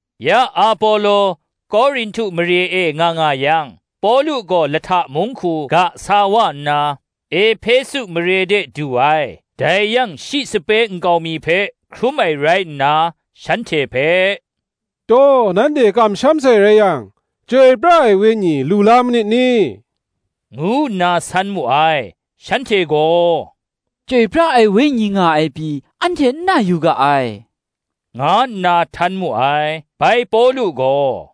Ya Apolo Korinhtu mare e nga nga yang, Pawlu gaw lahta mung hku ga sa wa nna, Ehpesu mare de du ai: dai yang shi sape nkau mi hpe hkrum ai rai nna, shanhte hpe, “Taw nanhte kamsham sai rai yang, Chyoi pra ai Wenyi lu la manit ni?” ngu nna san mu ai: shanhte gaw “Chyoi pra ai Wenyi nga ai pyi, anhte n na yu ga ai,” nga nna htan mu ai. Bai Pawlu gaw,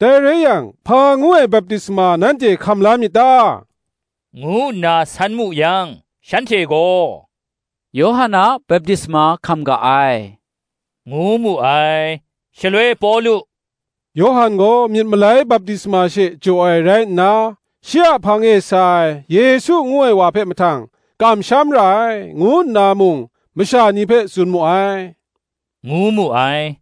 “Dai rai yang, hpa ngu ai baptisma nanhte hkam la myit ta?” ngu nna san mu yang, shanhte gaw, “Yawhan a baptisma hkam ga ai,” ngu mu ai. shaloi Pawlu, “Yawhan gaw myit malai baptisma she jaw ai rai nna, shi a hpang e sa ai, Yesu ngu ai wa hpe mahtang, kamsham ra ai,” ngu nna mung masha ni hpe tsun mu ai, ngu mu ai.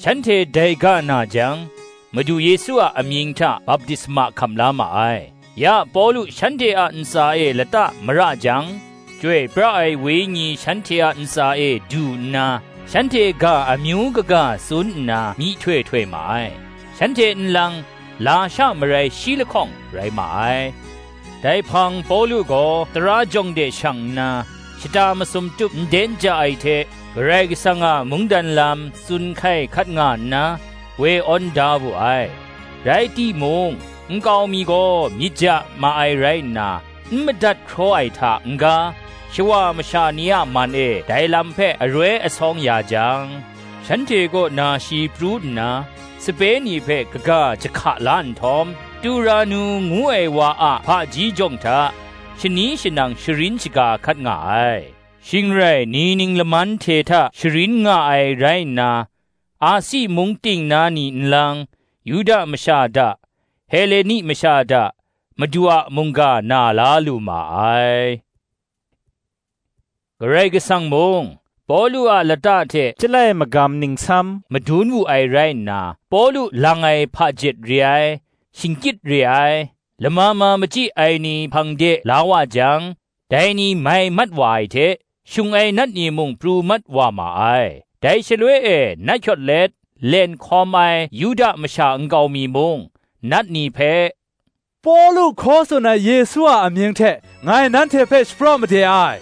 Shanhte dai ga na jang, Madu Yesu a amying hta baptisma hkam la ma ai. Ya Pawlu shanhte a ntsa e lata mara jang, Chyoi pra ai Wenyi shanhte a ntsa e du nna, shanhte ga amyu kaga tsun nna myihtoi htoi ma ai. Shanhte nlang, lasha marai shi lahkawng rai ma ai. Dai hpang Pawlu gaw tara jawng de shang nna, shata masum tup nden ja ai hte Karai Kasang a mungdan lam tsun hkai hkat nga nna, woi awn da wu ai. Rai timung, nkau mi gaw myit ja ma ai rai nna, n madat hkraw ai hta n-ga, shawa masha ni a man e ndai Lam hpe aroi asawng ya jang, shanhte kaw na shi pru nna, sape ni hpe kaga jahka la nhtawm, Turanu ngu ai wa a hpaji jawng hta, shani shanang sharin shaga hkat nga ai. Shing rai ni ning laman hte hta sharin nga ai rai nna, Asi mung ting na ni nlang, Yuda masha da, Heleni masha da, Madu a mungga na la lu ma ai. Karai Kasang mung, Pawlu a lata hte chyalai magam ningsam madun wu ai rai nna, Pawlu lang ai hpajet re ai, shingkyit re ai, lama ma machyi ai ni hpang de la wa jang, dai ni mai mat wa ai hte, shung ai nat ni mung pru mat wa ma ai. Dai shaloi e nat hkyawt let, len hkawm ai Yuda masha nkau mi mung, nat ni hpe, “Pawlu hkaw tsun ai Yesu a amying hte ngai nanhte hpe shapraw made ai,”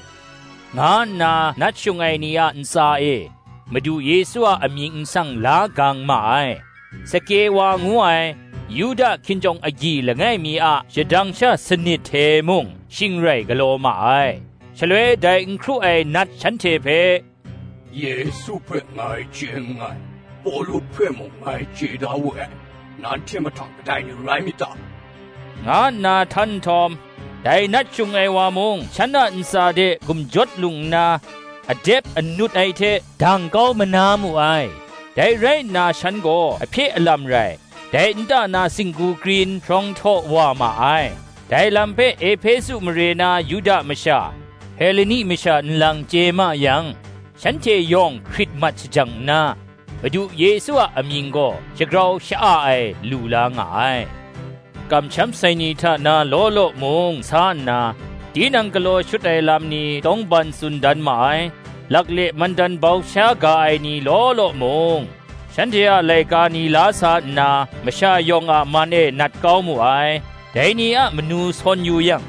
nga nna nat shung ai ni a ntsa e Madu Yesu a amying nsang la gang ma ai. Skewa ngu ai, Yuda hkinjawng agyi langai mi a shadang sha sanit hte mung shing rai galaw ma ai. Shaloi dai n hkru ai nat shanhte hpe, “Yesu hpe ngai chye nngai. Pawlu hpe mung ngai chye da we ai; nanhte mahtang kadai ni rai myit ta?” nga nna htan nhtawm, dai nat shung ai wa mung shan a ntsa de gumjawt lung nna, adep anut ai hte, dang kau manu ai; dai rai nna shanhte gaw ahpye alam rai, dai nta na singgu krin hprawng htaw wa ma ai. Dai lam hpe Ehpesu mare na Yuda masha, Heleni masha nlang chye ma yang, shanhte yawng hkrit mat shajang nna, Madu Yesu a amying gaw shagrau sha-a ai lu la nga ai. Kamsham sai ni hta na law law mung sa nna, tinang galaw shut ai lam ni tawngban tsun dan ma ai. Lakle mandan bau sha ga ai ni law law mung, shanhte a laika ni la sa nna, masha yawng a man e nat kau mu ai: dai ni a manu sawn yu yang,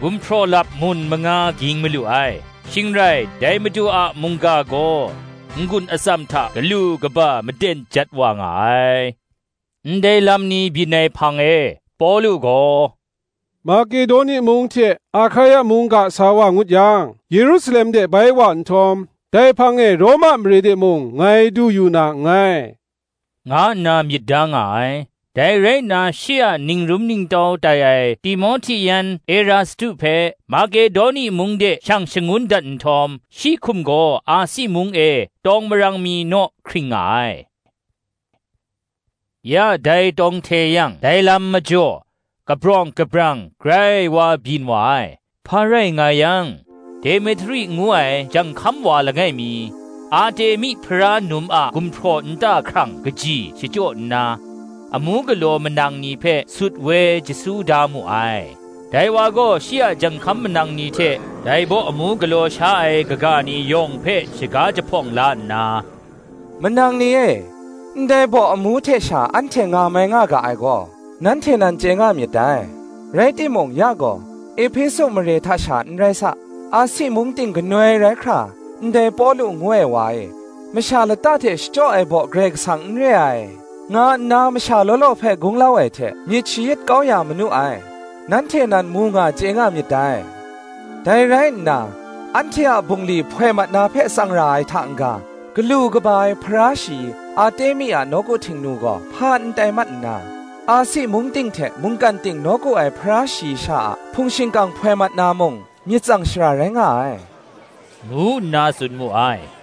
gumhpraw lap mun manga ging malu ai. Shing rai, dai Madu a mungga gaw n-gun atsam hta galu kaba maden jat wa nga ai. Ndai lam ni byin ai hpang e, Pawlu gaw, Makedoni mung hte Ahkaia mung ga sa wa ngut yang, Yerusalem de bai wa nhtawm, “Dai hpang e Roma mare de mung ngai du yu na nngai,” nga nna myit da nga ai. Dai rai nna shi a ningrum ningtau tai ai Timohti yan Erastu hpe, Makedoni mung de shawng shangun dat nhtawm, shi hkum gaw Asi mung e tawng marang mi naw hkring nga ai. Ya dai tawng hte yang dai lam majaw Kabring kabrawng grai wa byin wa ai. Hpa rai nga yang, Demetri ngu ai janghkam wa langai mi, Artemi Hpara num a gumhpraw nta hkrang kaji shachyaw nna, amu galaw manang ni hpe sut woi jasu da mu ai; dai wa gaw shi a janghkam manang ni hte, dai baw amu galaw sha ai kaga ni yawng hpe shaga jahpawng la nna, “Manang ni e, ndai baw amu hte sha anhte ngamai nga ga ai gaw, nanhte nan chye nga myit dai. Rai timung ya gaw, Ehpesu mare hta sha nrai sa, Asi mung ting ganoi rai hkra, ndai Pawlu ngu ai wa e, masha lata hte shachyaw ai baw Karai Kasang n re ai, nga nna masha law law hpe gunglau ai hte myit shayit kau ya manu ai, nanhte nan mu nga chye nga myit dai. Dai rai nna, anhte a bungli hpoi mat na hpe tsang ra ai hta n-ga, galu kaba ai Hpara shayi Artemi a nawku htingnu gaw hpa n tai mat nna, Asi mung ting hte mungkan ting nawku ai Hpara shayi sha a hpung shingkang hpoi mat na mung, myit tsang shara rai nga ai,” ngu nna tsun mu ai.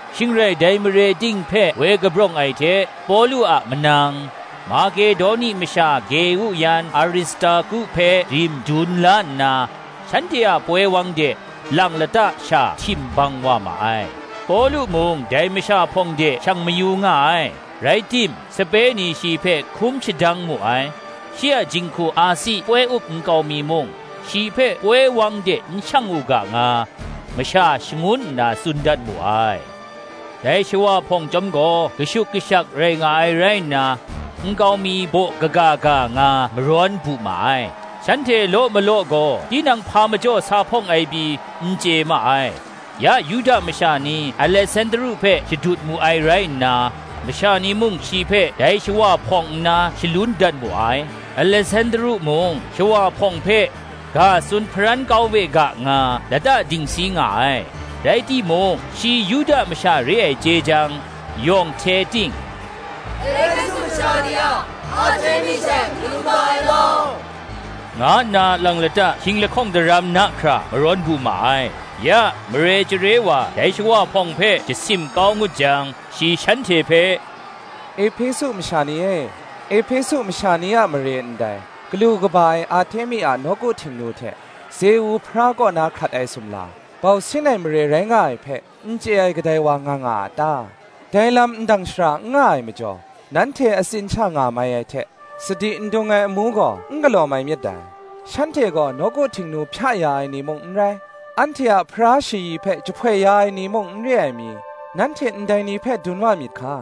Shing rai dai mare ting hpe woi kabrawng ai hte, Pawlu a manang, Makedoni masha Geu yan Aristarku hpe rim dun la nna, shanhte a poi wang de lang lata sha htim bang wa ma ai. Pawlu mung dai masha hpawng de shang mayu nga ai, rai tim sape ni shi hpe hkum shadang mu ai. Shi a jinghku Asi poi up nkau mi mung, shi hpe poi wang de n shang u ga nga, masha shangun nna tsun dat mu ai. Dai shawa hpawng chyawm gaw kashuk kashak rai nga ai rai nna, nkau mi baw kaga ga nga marawn bu ma ai; shanhte law malaw gaw tinang hpa majaw sa hpawng ai pyi, n chye ma ai. Ya Yuda masha ni Alesandru hpe shadut mu ai rai nna, masha ni mung shi hpe dai shawa hpawng nna shalun dat mu ai. Alesandru mung shawa hpawng hpe ga tsun hparan kau we ga nga, lata dingsi nga ai. Rai timung shi Yuda masha re ai chye jang, yawng hte ting, “Ehpesu masha ni a Artemi she galu kaba ai law,” nga nna lang lata hkying lahkawng daram na hkra marawn bu ma ai. Ya, mare chyare wa dai shawa hpawng hpe jasim kau ngut jang, shi shanhte hpe, “Ehpesu masha ni e, Ehpesu masha ni a mare ndai, galu kaba ai Artemi a nawku htingnu hte Zeu hpara kaw na hkrat ai sumla, bau sin ai mare rai nga ai hpe, n chye ai, kadai wa nga nga a ta? Dai lam ndang shara n nga ai majaw, nanhte atsin sha nga mai ai hte, sadi n dung ai amu gaw n galaw mai myit dai. Shanhte gaw nawku htingnu hpya ya ai ni mung n rai, anhte a Hpara shayi hpe jahpoi ya ai ni mung n re ai mi, nanhte ndai ni hpe dun wa myit hka.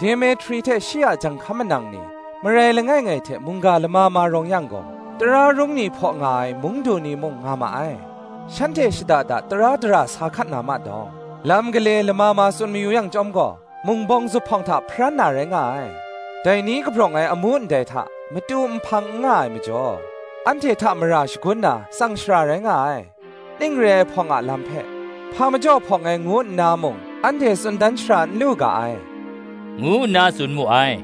Demetri hte shi a janghkam manang ni, marai langai ngai hte mungga lama ma rawng yang gaw, tara rung ni hpaw nga ai, mung du ni mung nga ma ai; shanhte shada da tara dara sa hkat na ma dawng. Lam gale lama ma tsun mayu yang chyawm gaw, mung bawng zuphpawng hta hparan na rai nga ai. Dai ni kabrawng ai amu ndai hta, matu nhpang n nga ai majaw, anhte hta mara shagun na, tsang shara rai nga ai: ning re ai hpawng a lam hpe, hpa majaw hpawng ai ngu nna mung, anhte tsun dan shara n lu ga ai,” ngu nna tsun mu ai.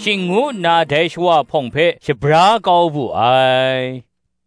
Shing ngu nna dai shawa hpawng hpe shabra kau wu ai.